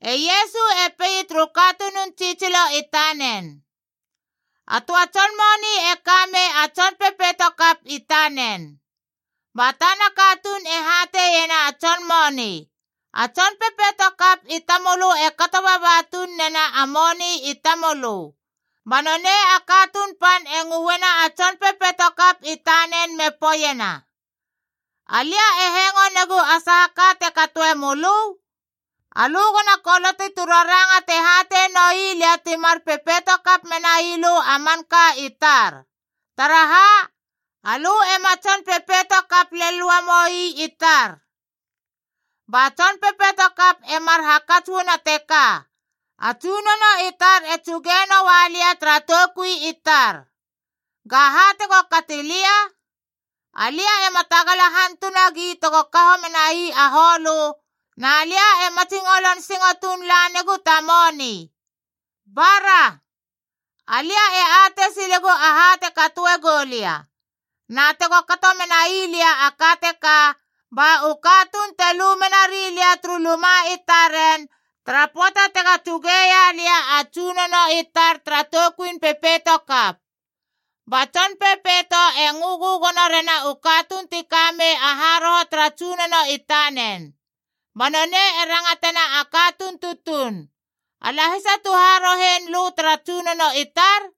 E Iesu e pei turu katunun tsitsilo i tanen, “A töa tson moni e ka mei a tson pepeitokap i tanen. Ba tana katuun e hateiena a tson moni, ‘A tson pepeitokap i tamölö e kato baba tuun nena a moni i tamölö!’ Ba nonei a katuun pan e ngöena a tson pepeitokap i tanen me poeiena, ‘Alia e hengo negu a saha ka te katoe mölö? Alö gona koloti tu raranga te hatei noi lia ti mar pepeitokap menai lö a manka i tar. Taraha? Alö ema tson pepeito kap lel uamou ii tar.’ “Ba tson pepeitokap e mar hakats uana teka, ‘A tsunono i tar e tsuge noa lia tara toukui i tar. Gaha tego kati lia? Alia ema tagala hantunagi tego kaho menai a holö, na lia e matsingolon singo tuun lanegu ta moni. Bara, alia e atei silegu aha te katoe gou lia! Na tego kato menai lia a ka teka, ba u katuun te lu menari lia turu luma i taren tara pöata tega tsugeia lia a tsunono i tar tara toukuin pepeitokap.’ Ba tson pepeito e ngö gögono rena u katuun ti ka mei a haroho tara tsunono i tanen. Ba nonei e rangatena a katuun tutuun, ‘A lahisa tu harohen lö tara tsunono i tar?’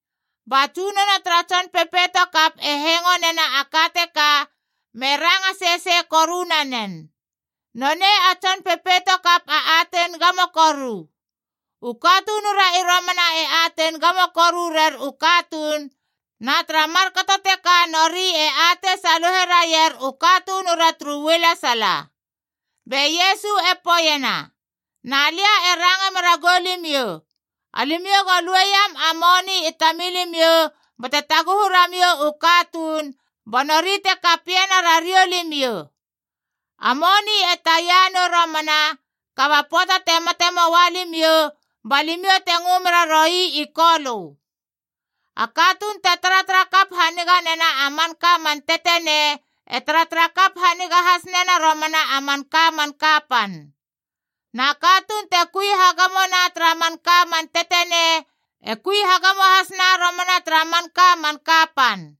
Ba tsunono tara tson pepeitokap e hengo nena a ka teka me ranga sesei koru nanen. ‘Nonei a tson pepeitokap a atein gamo koru.’ U katunura i romana e atein gamo koru rer u katuun, na tara markato teka nori e atei saluhe raier u katunura turu ualesala.” Be Iesu e poeiena, “Na lia e ranga mera goulimiou, alimiou go lueiam a moni i tamilimiou bate taguhu ramiou u katuun ba nori te kapiena rariou limiou. A moni e taia nou romana, kaba pöata te mate moa limiou, ba limiou te ngö mera roi i Kolö. A katuun te taratara kap haniga nena a manka man tetenei e taratara kap haniga has nena romana a manka man kapan. Na a katuun te kui hagamona tara manka man tetenei e kui hagamo hasna romana tara manka man kapan.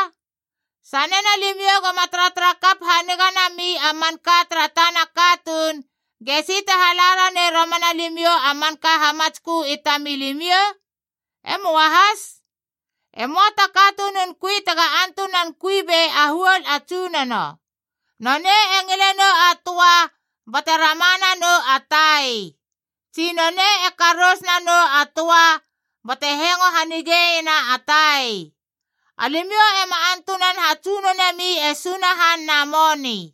Na sanena limiou goma taratara kap haniga nami a manka tara tana katuun, gesi te hala ranei romana limiou a manka hamatskö i tamilimiou? E möa has. “E möa ta katunun kui tega antunan kui bei a huol a tsunono. Nonei e ngile nou a töa bate rama nanou a tai. Tsi, nonei e karous nanou a töa bate hengo hanigeiena a tai. Alimiou ema antunan hatsunonemi e Sunahan na moni.”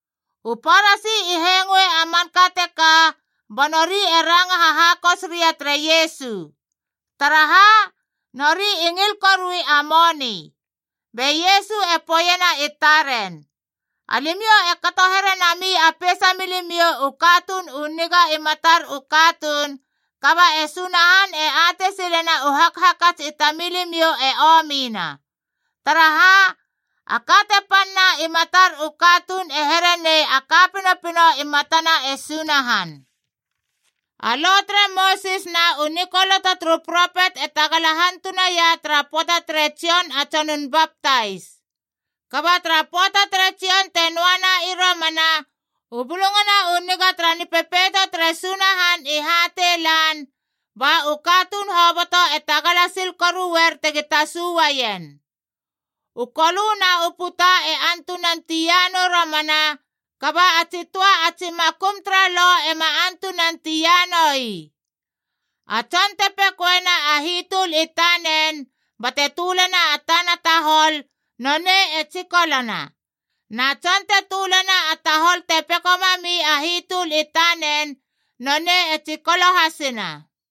U Parasi i hengoe a manka teka, ba nori e ranga hahakos ria tere Iesu. Taraha? Nori i ngil korui a moni. Be Iesu e poeiena i taren, “Alimiou e kato here nami a peisa milimiou u katuun u niga i matar u katuun, kaba e Sunahan e atei silena u hakhakats i tamilimiou e omina. Taraha? A ka te panna i matar u katuun e here nei a ka pinopino i matana e Sunahan. “A Lo tere Mosis na u nikoloto turu propet e tagala hantunaia tara pöata tere Jon a Tsonun Baptais. Kaba tara pöata tere Jon te noana i romana, u Bulungana u Niga tara Nipepeito tere Sunahan i hatei lan, ba u katuun hoboto e tagala sil koruer tegi tasu uaien. U kolö na u puta e antunan tia nou romana, kaba a tsi töa a tsi makum tara Lo ema antunan tia noi. A tson te pekoena a hitöl i tanen bate tölena tana tahol, nonei e tsikolona. Na tson te tölena a tahol te peko mami a hitöl i tanen, nonei e tsikolo hasina.”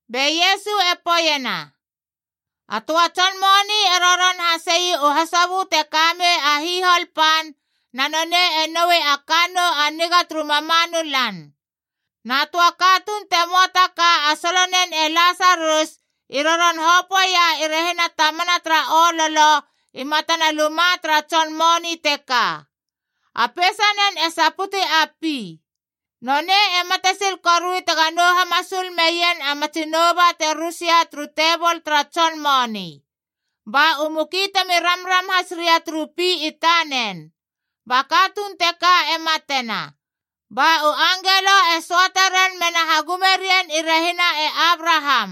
Be Iesu e poeiena, “A töa tson moni e roron hasei u hasobö te ka mei a hihol pan, na nonei e noui a kannou a niga turu mamanu lan. Na töa katuun te möa ta ka a solonen e Lasarus i roron hopöeia i rehina tamana tara ololo i matana luma tara tson moni teka. A peisanen e saputi a pi. Nonei e matesil korui tega nou hamasul meien a matsi nouba te rusia turu tebol tara tson moni. Ba u muki temi ramram has ria turu pi i tanen. Ba katuun teka e matena, ba u angelo e söate ren mena hagume rien i rehina e Abraham.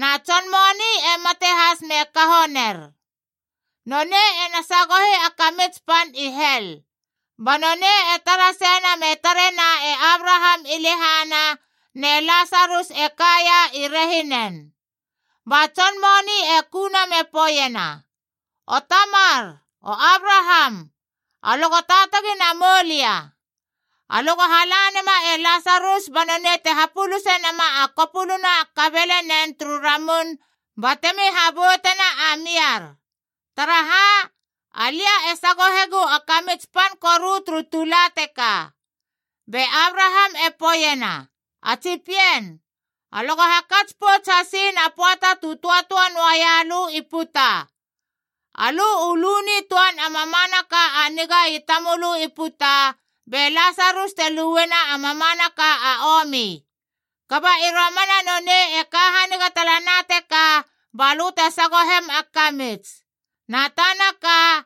Na tson moni e mate has me kaho ner. Nonei ena sagohi a kamits pan i hel, ba nonei e tara seina me tarena e Abraham i lehana, ne Lasarus e kaia i rehinen. Ba tson moni e kuna me poeiena, ‘O Tamar, O Abraham, alö go taatagi namou lia! Alö go hala nema e Lasarus ba nonei te hapuluse nama a kopuluna a kabelenen turu ramun batemi haboutena a miar. Taraha? Alia e sagohegu a kamits pan koru turu tula teka!’ Be Abraham e poeiena, ‘A tsi pien, alö go hakats pouts hasiin a pöata tu töatöa noaia lö i puta. Alö u lu nitöan a mamanaka a niga i tamölö i puta, be Lasarus te luena a mamanaka a omi. Kaba i romana nonei e ka haniga talana teka ba lö te sagohem a kamits. Na tana ka,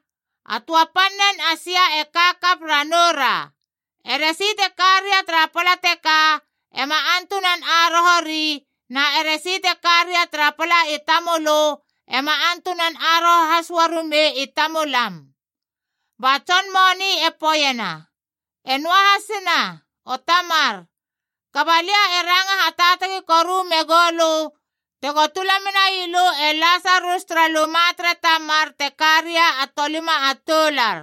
a töa pannen a sia e ka kap ranou ra. Eresi te karia tara pala teka ema antunan aroho ri, na eresi te karia tara pala i tamölö ema antunan aroho has uarumei i tamulam.’ “Ba tson moni e poeiena, ‘E noahasina, o Tamar, kaba alia e ranga hataatagi koru megou lö tego tula menai lö e Lasarus tara luma tere tamar te ka ria a tolima a toular.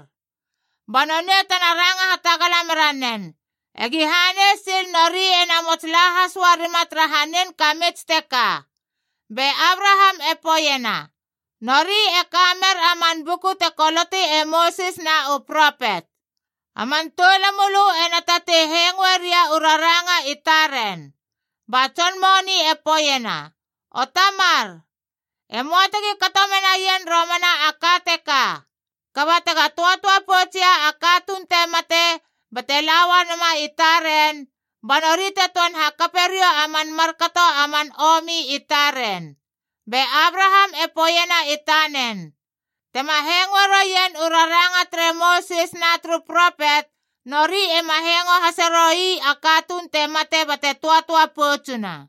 Ba nonei tena ranga hatagala mera nen, egi hanei sil nori e namots la has uarima tara hanin kamits teka!’ Be Abraham e poeiena, ‘Nori e ka mer a man buku te koloti e Mosis na u propet. A man toulamölö ena tatei hengoe ria u raranga i taren.’ Ba tson moni e poeiena, ‘O Tamar, e möa tegi kato menaien romana a ka teka. Kaba tega töatöa poutsia a katuun te mate bate la uana i taren, ba nori te töan hakape riou a man markato a man omi i taren.’ Be Abraham e poeiena i tanen, ‘Tema hengoe roien u raranga tere Mosis na turu propet, nori ema hengo hase roi a katuun te mate bate töatöa poutsuna!’”